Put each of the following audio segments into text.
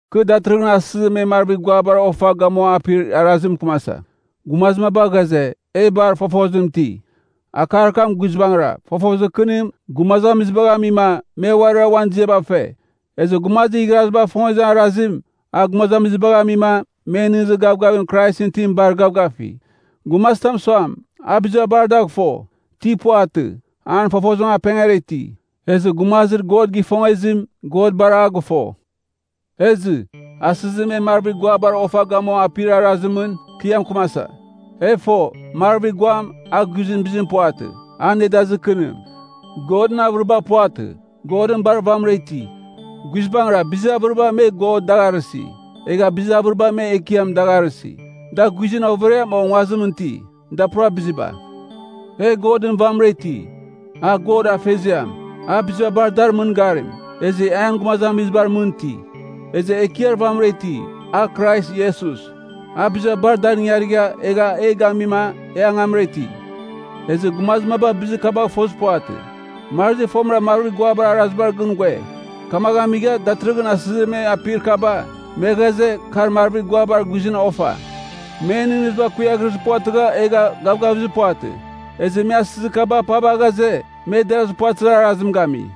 Kɨ datɨrɨghɨn asɨzir me marvir guabar ofa gamua apir arazimɨn mɨkɨmasa. Gumazir maba ghaze, “E bar, fofozim iti.” Akar kam guizbangɨra, fofozir kɨnim, gumazamizibagh amima, me uarira uan ziaba fe. Ezɨ gumazir igharazibagh ifongezir arazim, a gumazamizibagh amima, men nɨghnɨzir gavgavir Kraisɨn itim bar gavgafi. Gumazitam suam, a biziba bar dagh fo. Ti puvatɨ, an fofozim apengara iti. Ezɨ gumazir God gifongezim, God bar a gɨfo. Ezɨ, asɨzir me marvir guabar ofa gamua apir arazimɨn, kɨ a mɨkɨmasa. E fo, marvir guam, a guizɨn bizim puvatɨ, a nedazir kɨnim. Godɨn avɨriba puvatɨ. Godɨn bar vamɨra iti. Guizbangɨra, bizir avɨriba me “god” dagh arɨsi, egha bizir avɨriba me “ekiam” dagh arɨsi. Da guizɨn overiam o nguazimɨn iti, da pura biziba. E Godɨn vamɨra iti, a God Afeziam. A biziba bar dar mɨngarim, ezɨ e an gumazamizibar mɨn iti. Ezɨ Ekiar vamɨra iti, a Krais Iesus. A biziba bar dar ingarigha, egha e gamima, e angamra iti. Ezɨ gumazir maba bizir kabagh fozir puvatɨ. Marazi fomɨra marvir guabar arazibar gɨn ghue, kamaghɨn amigha, datɨrɨghɨn asɨzir me apir kaba, me ghaze, kar marvir guabar guizɨn ofa. Men nɨghnɨziba kuiaghrezir puvatɨgha egha gavgavizir puvatɨ, ezɨ me asɨzir kaba apava ghaze, me derazir puvatɨzir arazim gami.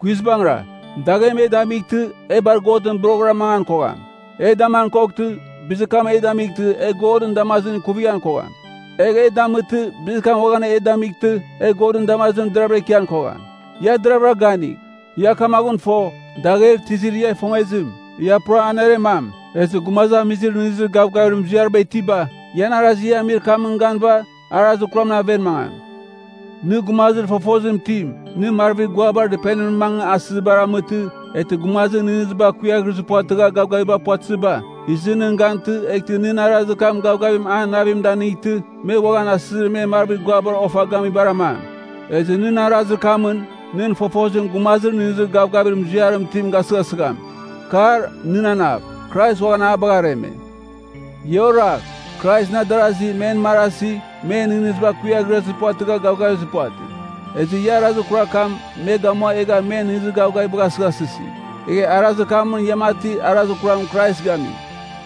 Guizbangɨra, daghem e damightɨ, e bar Godɨn boroghɨra mangan kogham. E daman koghtɨ, bizir kam e damightɨ, e Godɨn damazimɨn ikuvighan kogham. Egh e damɨtɨ, bizir kam uaghan e damightɨ, e Godɨn damazimɨn deravɨra ikian kogham. Ia deravɨra ganigh. Ia kamaghɨn fo, dagher tizir ia ifongezim, ia pura aneremam. Ezɨ gumazamizir nɨghnɨzir gavgavir muziariba itiba, ian arazir ia amir kamɨn ganɨva, arazir kuramɨn aven mangam. Nɨ gumazir fofozim itim, nɨ marvir guabar dɨpenimɨn mangɨ asɨzibar amɨtɨ, eghtɨ gumazir nɨghnɨziba kuiaghrezir puvatɨgha gavgavizir puvatɨziba, izɨ nɨn gantɨ, eghtɨ nɨn arazir kam gavgavim an navim a danightɨ, me uaghan asɨzir me marvir guabar ofa gamibar amam. Ezɨ nɨn arazir kamɨn, nɨn fofozim gumazir nɨghnɨzir gavgavir muziarim itim gasɨghasɨgham. Kar, nɨn anav, Krais uaghan a bagha areme. Ia oragh. Kraisɨn adarazi, men marazi, men nɨghnɨziba kuiaghrezir puvatɨgha gavgavizir puvatɨ. Ezɨ ia arazir kurar kam me gamua egha men nɨghnɨzir gavgavibagh asɨghasɨsi, egha arazir kamɨn ia mati arazir kuram Krais gami.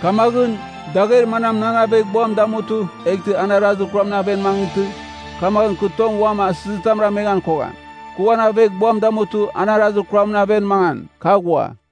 Kamaghɨn, dagher manam nan aveghbuam damutɨ, eghtɨ an arazir kuramɨn aven mangɨtɨ, kamaghɨn kɨ tong uam asɨzitam rameghan kogham. Kɨ uan aveghbuam damutɨ, an arazir kuramɨn aven mangan, kɨ aghua.